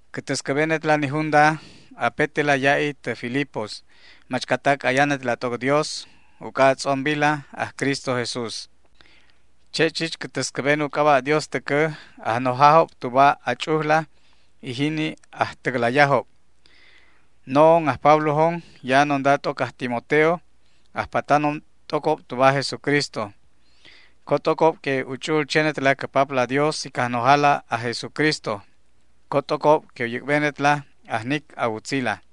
Cä täscäbenetla ni junda, apetela ya'i tä Filipos machcatac ayanetla t'oc Dios uc'a a tz'ombila aj Cristo Jesús. Che' chich cä täscäben u c'aba' Dios täcä ajnojajob tuba a ch'ujla y jini ajtäclayajob. No'on aj Pablojon, ya'anonda t'oc aj Timoteo, ajpatanon t'ocob tuba aj Jesucristo. Co t'ocob que u ch'u'ul chenetla cä Papla Dios y Cajnojala aj Jesucristo. Co t'ocob que u yäc'benetla ajnic a wutzila.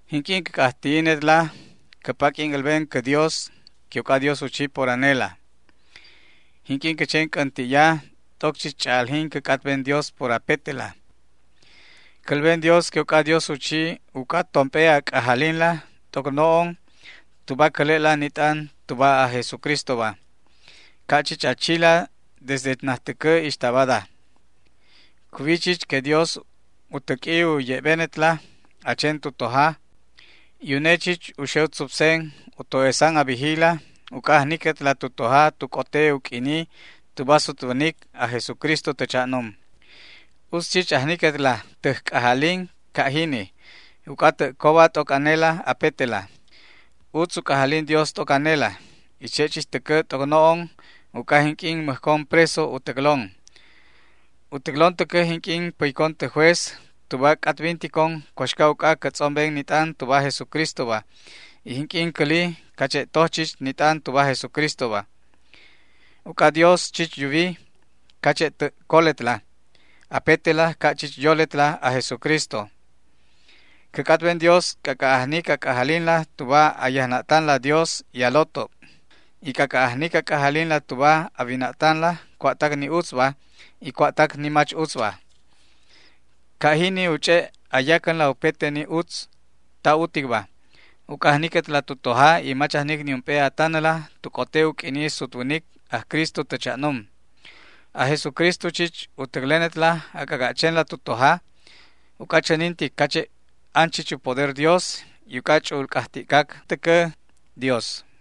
Jinq'uin cä c'ajti'inetla, cä paq'uin älben cä Dios que uc'adios u chi por anela. Jinq'uin cä chen c'änti'ya, t'oc chich ch'a'aljin cä c'atben Dios por apetela. Cälben Dios que uc'adios u chi uc'a tomp'e a c'ajalinla t'oc no'on tuba cäle'la ni t'an tuba aj Jesucristoba, ca' chich a chila desde najtäcä ixta bada. Cuwi chich que Dios u täq'ui u ye'benetla a chen tu toja y une chich u xe u tzupsen u to'esan a bijila uc'a ajniquetla tu toja tu c'ote u q'uini tuba sutwänic aj Jesucristo tä cha'num. Utz chich ajniquetla täj c'ajalin ca' jini, uc'a tä' coba t'oc anela apetela. Utz u c'ajalin Dios t'oc anela y che' chich täcä t'oc no'on uc'a jinq'uin mäjcon preso u täclon. U täclon täcä jinq'uin päycon tä juez tuba c'atbinticon cuaxca uc'a cä tz'omben ni t'an tuba aj Jesucristoba y jinq'uin cäli cache' toj chich ni t'an tuba aj Jesucristoba. Uc'a Dios chich yuwi cache' tä' coletla apetela ca' chich yoletla aj Jesucristo. Cä c'atben Dios c'ac'a' ajnic a c'ajalinla tuba a yajna'tanla Dios y a lotob, y c'ac'a' ajnic a c'ajalinla tuba a wina'tanla cua'tac ni utzba y cua'tac ni mach utzba. Ca' jini u ch'e' a yacänla upete ni utz ta uticba, uc'a ajniquetla tu toja y mach ajnic niump'e a tanäla tu c'ote u q'uini sutwänic aj Cristo tä cha'num. Aj Jesucristo chich u täclenetla a c'ac'a' chenla tu toja, uc'a chänintic cache' an chich u poder Dios, y uc'a ch'u'ul c'ajti'cac täcä Dios.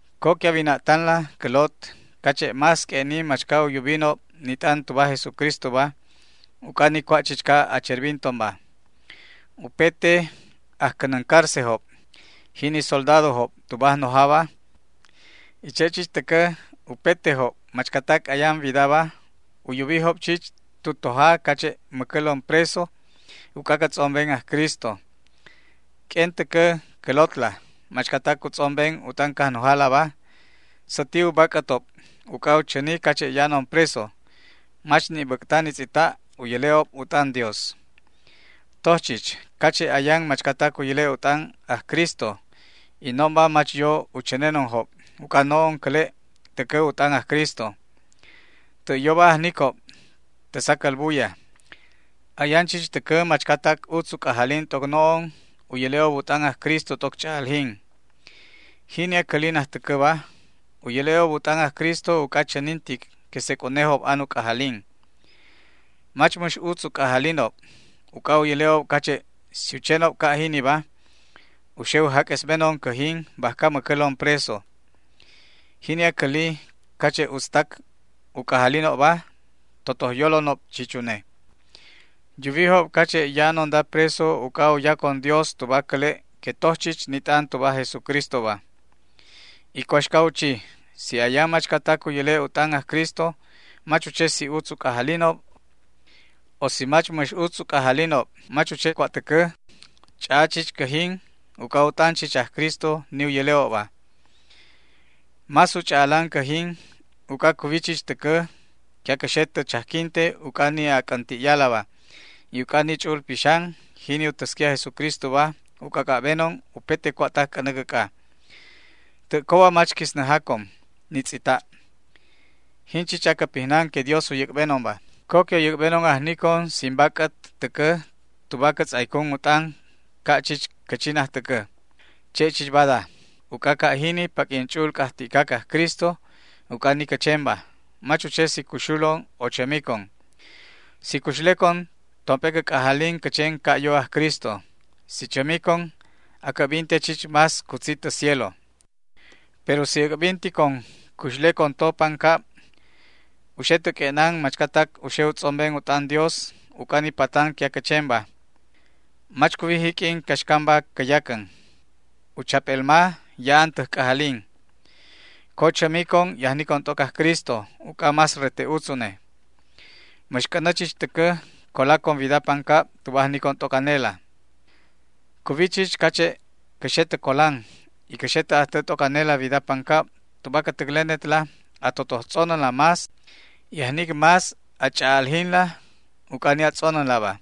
Co que a wina'tanla, cä lot, cache' más q'ue'ni machca u yubinob ni t'an tuba aj Jesucristoba uc'a ni cua' chichca acherbintonba. Upete ajcänäncárcejob, jini soldadojob tuba ajnojaba, y che' chich täcä upetejob machcatac ayan widaba u yubijob chich tu toja cache' mäcälon preso uc'a cä tz'omben aj Cristo. Q'uen täcä cä lotla, machcatac u tz'omben u t'an Cajnojalaba, säti u bac'ätob uc'a u chäni cache' ya'anon preso. Mach ni' bäc'ta ni tz'ita' u yäle'ob u t'an Dios. Toj chich cache' ayan machcatac u yäle' u t'an aj Cristo y no'onba mach yo u chänenonjob uc'a no'on cäle' täcä u t'an aj Cristo. Tä' yoba ajnicob tä sacäl buya. Ayan chich täcä machcatac utz u c'ajalin t'oc no'on u yäle'ob u t'an aj Cristo t'oc ch'a'aljin. Jini acäli najtäcäba u yäle'ob u t'an aj Cristo uc'a chänintic que sec' unejob an u c'ajalin. Mach mäx utz u c'ajalinob uc'a u yäle'ob cache' si u chenob ca' jiniba u xe u jaq'uesbenon cäjin bajca mäcälon preso. Jini acäli cache' utztac u c'ajalinobba totoj yolonob chich une. Yuwijob cache' ya'anonda preso uc'a u yacon Dios tuba cäle' que toj chich ni t'an tuba aj Jesucristoba. ¿Y cuaxca u chi? Si ayan machcatac u yäle' u t'an aj Cristo, mach u che si utz u c'ajalinob; o si mach mäx utz u c'ajalinobba, mach u che cua' täcä. Ch'a'a chich cäjin uc'a u t'an chich aj Cristo ni u yäle'obba. Más u ch'a'alan cäjin, uc'a cuwi chich täcä que acä xe tä chajquinte uc'a ni a c'änti'yalaba, y uc'a ni Ch'u'ul Pixan jini u täsqui aj Jesucristoba u c'ac'a' benon upete cua'tac c'änä cäc'a. Tä' coba mach quisnäjacon ni tz'ita'. Jin jini chich acä pijnan que Dios u yäc'benonba. Co que u yäc'benon ajnicon sin bac'ät täcä tuba cä tz'aycun u t'an ca' chich cä chi najtäcä, che' chich bada, uc'a ca' jini paq'uin ch'u'ul c'ajti'cac aj Cristo uc'a ni cä chenba, mach u che si cuxulon o chämicon. Si cuxlecon, tomp'e cä c'ajalin cä chen ca' yo aj Cristo. Si chämicon, acä'binte chich más cutzi tä cielo. Pero si äc'binticon cuxlecon to pancab, u xe tä q'ue'nan machcatac u xe u tz'omben u t'an Dios uc'a ni patan que acä chenba. Mach cuwi jiq'uin caxcamba cä yacän. U chap'elma ya'an täj c'ajalin. Co chämicon y ajnicon t'oc aj Cristo, uc'a más rete utz une. Mäx c'änä chich täcä colacon wida pancab tuba ajnicon t'oc anela. Cuwi chich cache' cä xe tä colan, y cä xe tä ajtä t'oc anela wida pancab tuba cä täclenetla a totoj tz'onänla más, y ajnic más a ch'a'aljinla uc'a ni a tz'onänlaba.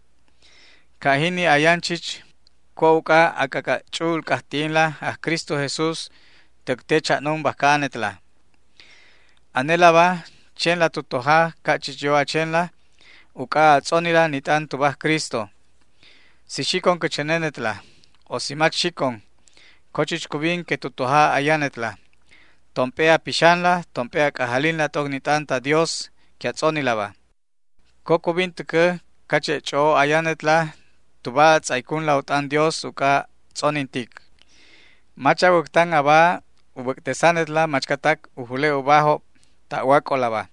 Ca' jini ayan chich cua' uc'a a c'ac'a' ch'u'ul c'ajti'inla aj Cristo Jesús täc te cha'num bajca anetla. Anelaba, chenla tu toja ca' chich yo a chenla uc'a a tz'onila ni t'an tuba aj Cristo. Si xicon cä chänenetla o si mach xicon, co chich cubin que tu toja ayanetla, tomp'e a pixanla, tomp'e a c'ajalinla t'oc ni t'an ta Dios que a tz'onilaba. Co cubin täcä cache' ch'o'o ayanetla tuba a mul tz'aycunla u t'an Dios uc'a tz'onintic. Mach a wäctan aba u bäc'tesanetla machcatac u jule' ubajob ta'wac'olaba,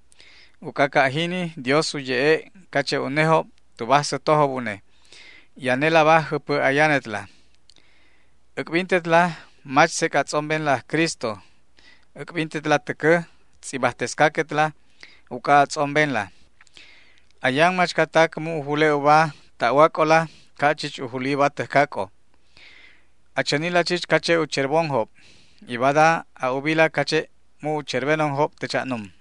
uc'a ca' jini Dios u ye'e' cache' unejob tuba ajsätojob une, y anelaba jäpä ayanetla. Äc'bintetla mach sec' a tz'ombenla aj Cristo. Äc'bintetla täcä tz'ibajtescaquetla uc'a a tz'ombenla. Ayan machcatac mu' u jule' uba ta'wac'ola ca' chich u juli uba täjcac'ojob. A chänila chich cache' u cherbonjob, y bada a ubila cache' mu' u cherbenonjob tä cha'num.